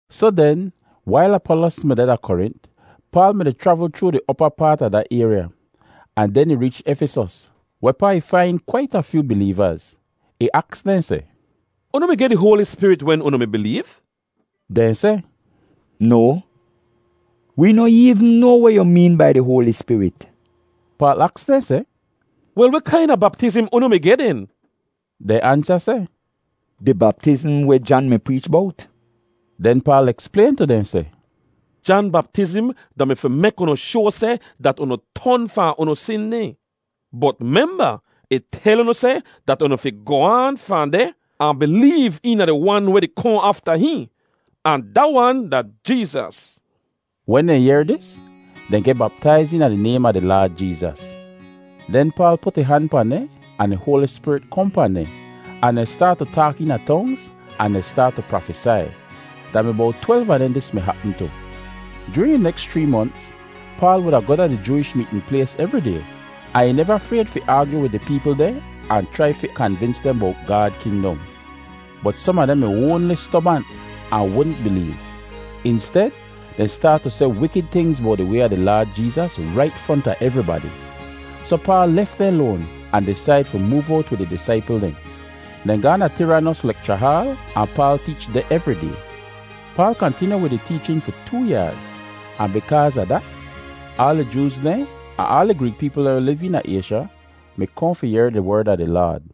Soh den, wail Apolos mi deh da Korint, Paal mi-di chravl chroo di opa paat a da ayrya, ahn den ih reech Efisos, wehpaa ih fain kwait a fyoo bileevaz. Ih aks dehn seh, “Unu mi geh di Hoali Spirit wen unu mi bileev?” Dehn seh, “No, wee noh eevn noa weh yu meen bai di Hoali Spirit.” Paal aks dehn seh, “Wel, weh kaina baptizm unu mi geh den?” Dehn ansa seh, “Di baptizm weh Jan mi preech bowt.” Den Paal eksplayn tu dehn seh, “Jan baptizm da-mi fi mek unu shoa seh dat unu ton fahn unu sin dehn. Bot memba, ih tel unu seh dat unu fi goh aan fahn deh ahn bileev eena di Wan weh di kohn afta hihn, ahn da wan da Jeezas.” Wen dehn yehr dis, dehn geh baptaiz eena di naym a di Laad Jeezas. Den Paal put ih han pahn dehn ahn di Hoali Spirit kohn pahn dehn, ahn dehn staat tu taak eena tongz ahn dehn staat tu prafesai. Da mi bowt twelv a dehn dis hapm tu. Joorin di neks chree monts, Paal wuda goh da di Jooish meetn plays evri day, ahn ih neva frayd fi aagyu wid di peepl dehn ahn chrai fi kanvins dehn bowt Gaad kingdom. Bot som a dehn mi oanli stobant ahn wudn bileev. Insted, dehn staat tu seh wikid tingz bowt di Way a di Laad Jeezas rait fronta evribadi. Soh Paal lef dehn loan ahn disaid fi moov owt wid di disaipl dehn. Dehn gaahn da Tiranos lekcha haal, ahn Paal teech deh evri day. Paal kantinyu wid ih teechin fi too yaaz, ahn bikaaz a dat, aal di Jooz dehn ahn aal di Greek peepl dehn weh liv eena Aysha, mi kohn fi yehr di Werd a di Laad.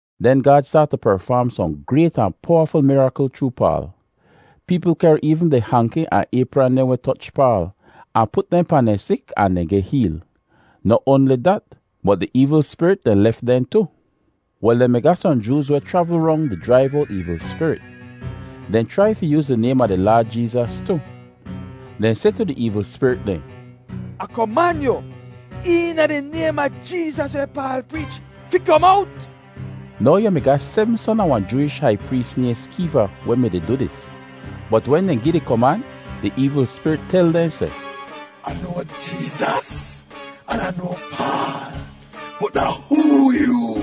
Den Gaad staat tu perfaam sohn grayt ahn powaful mirakl chroo Paal. Peepl kehr eevn di hanki ahn aypran dehn weh toch Paal, ahn put dehn pahn dehn sik ahn dehn geh heel. Noh oanli dat, bot di eevl spirit dehn lef dehn tu. Wel, dehn mi ga sohn Jooz weh chravl rong di jraiv owt eevl spirit. Dehn chrai fi yooz di naym a di Laad Jeezas tu. Dehn seh tu di eevl spirit dehn, “Ah koman yu, eena di naym a Jeezas weh Paal preech, fi kom owt.” Now yu mi ga sebm son a wahn Jooish hai prees nayhn Skeeva weh mi-di du dis. Bot wen dehn gi di koman, di eevl spirit tel dehn seh, “Ah noa Jeezas, an Ah noa Paal, bot da hoo yoo?”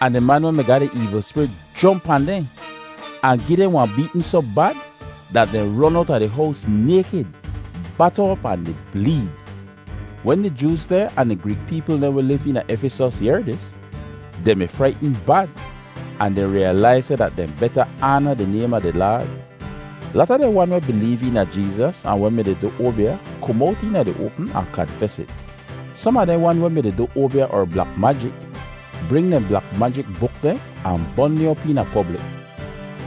Ahn di man weh mi ga di eevl spirit jomp pahn dehn, ahn gi dehn wahn beetn soh bad dat dehn ron owta di hows naykid, bata op ahn di bleed. Wen di Jooz dehn ahn di Greek peepl dehn weh liv eena Efisos yehr dis, dehn mi fraitn bad ahn dehn riyalaiz seh dat dehn beta aana di naym a di Laad. Lata dehn wan weh bileev eena Jeezas ahn weh mi-di du oabya kom owt eena di oapm ahn kanfes it. Som a dehn wan weh mi-di du oabya er blak majik bring dehn blak majik buk dehn ahn bon dehn op eena poblik.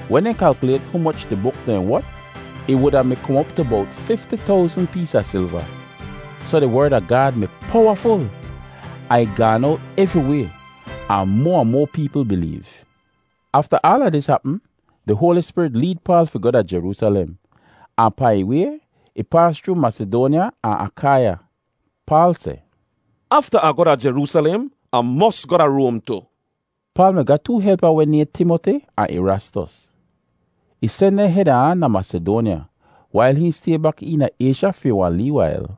Wen dehn kalkyulayt humoch di buk dehn wot, ih wuda mi kom op tu bowt fifti towzn pees a silva. Soh di Werd a Gaad mi powaful ahn ih gaan owt evriway ahn moa ahn moa peepl bileev. Afta aala dis hapm, di Hoali Spirit leed Paal fi goh da Jeroosalem, ahn pahn ih way, ih paas chroo Masidoanya ahn Akaiya. Paal seh, “Afta Ah goh da Jeroosalem, Ah mos goh da Roam tu.” Paal mi ga too helpa weh nayhn Timoti ahn Erastos. Ih sen dehn heda ahn da Masidoanya, wail hihn stay bak eena Aysha fi wahn lee wail.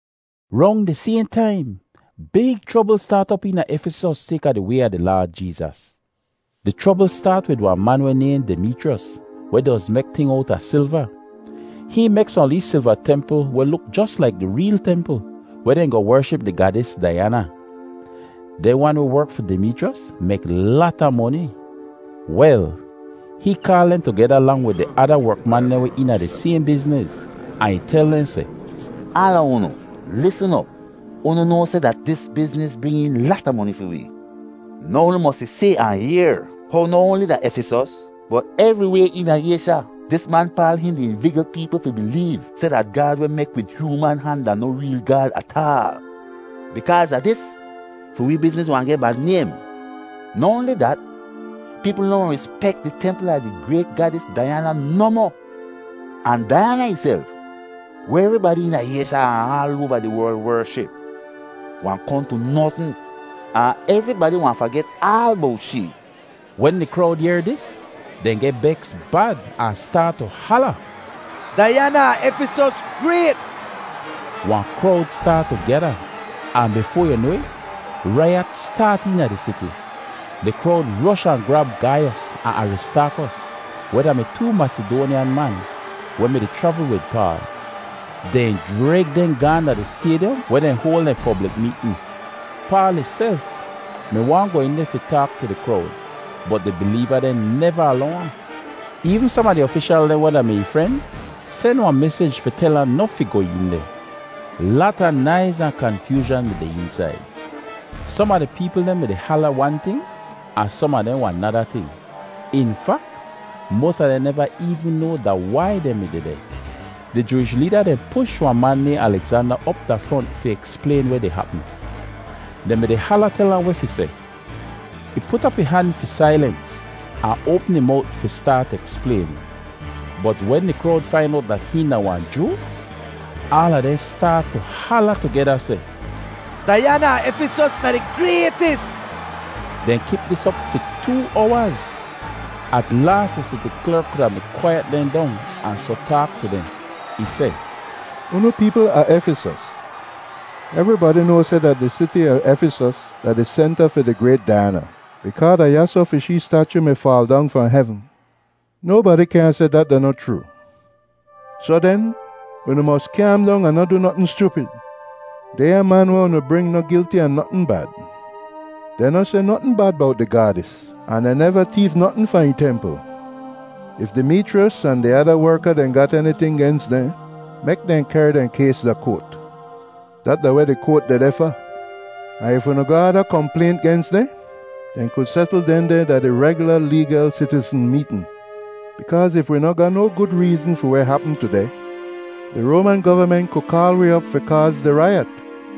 Rong di sayhn taim, big chrobl staat op eena Efisos sayka di Way a di Laad Jeezas. Di chrobl staat wid wahn man weh nayhn Dimeechriyos, weh doz mek ting owta silva. Hihn mek sohn lee silva templ weh luk jos laik di reel templ weh dehn goh wership di gaadis Daiyana. Dehn wan weh werk fi Dimeechriyos mek lata moni. Wel, hihn kaal dehn tugeda lang wid di ada werkman dehn weh eena di sayhn bizniz, ahn ih tel dehn seh, “Aala unu, lisn op. Unu noa seh dat dis bizniz bring een lata moni fi wee. Now unu mosi si ahn yehr how noh oanli da Efisos, bot evriway eena Aysha, dis man Paal hihn di invigl peepl fi bileev seh dat gaad weh mek wid hyooman han da noh reel gaad ataal. Bikaaz a dis, fi wee bizniz wahn geh bad naym. Noh oanli dat, peepl noh wahn rispek di templ a di grayt gaadis Daiyana nohmoh. Ahn Daiyana ihself, weh evribadi eena Aysha ahn aal oava di werl wership, wahn kohn tu notn, ahn evribadi wahn faget aal bowt shee.” Wen di krowd yehr dis, dehn geh beks bad ahn staat tu hala, “Daiyana a Efisos grayt!” Wahn krowd staat tu gyada, ahn bifoa yu noa it, raiyat staat eena di siti. Di krowd rosh ahn grab Gaiyos ahn Aristaakos, weh da-mi too Masidoanyan man weh mi-di chravl wid Paal. Dehn jreg dehn gaahn da di staydyom weh dehn hoal dehn poblik meetn. Paal ihself mi waahn goh een deh fi taak tu di krowd, bot di bileeva dehn neva alow ahn. Eevn som a di ofishal dehn weh da-mi ih fren sen wahn mesij fi tel ahn noh fi goh een deh. Lata naiz ahn kanfyoozhan mi deh eensaid. Som a di peepl dehn mi-di hala wan ting ahn som a dehn wahn nada ting. In fak, moas a dehn neva eevn noa da wai dehn mi dehdeh. Di Jooish leeda dehn push wahn man nayhn Alegzanda op da front fi eksplayn weh di hapm. Dehn mi-di hala tel ahn weh fi seh. Ih put op ih han fi sailens ahn oapm ih mowt fi staat eksplayn. Bot wen di krowd fain owt dat hihn da wahn Joo, aala dehn staat tu hala tugeda seh, “Daiyana a Efisos da di graytis!” Dehn kip dis op fi too owaz. At laas di siti klerk kuda mi kwaiyet dehn dong ahn soh taak tu dehn. Ih seh, “Unu peepl a Efisos, evribadi noa seh dat di siti a Efisos da di senta fi di grayt Daiyana bikaa da yasoh fi shee stachu mi faal dong fahn hevn. Nobadi kyaahn seh dat da noh chroo. Soh den, unu mos kyaam dong ahn noh du notn schupid. Dehnya man weh unu bring noh gilti a notn bad. Dehn noh seh notn bad bowt di gaadis ahn dehn neva teef notn fahn ih templ. If Dimeechriyos ahn di ada werka dehn gat eniting gens dehn, mek dehn kehr dehn kays da koat; dat da weh di koat dehdeh fa. Ahn if unu ga ada komplaynt gens dehn, dehn ku setl dehndeh da di regyula leegal sitizn meetn. Bikaaz if wi noh ga no gud reezn fi weh hapm tudeh, di Roaman govament ku kaal wi op fi kaaz di raiyat.”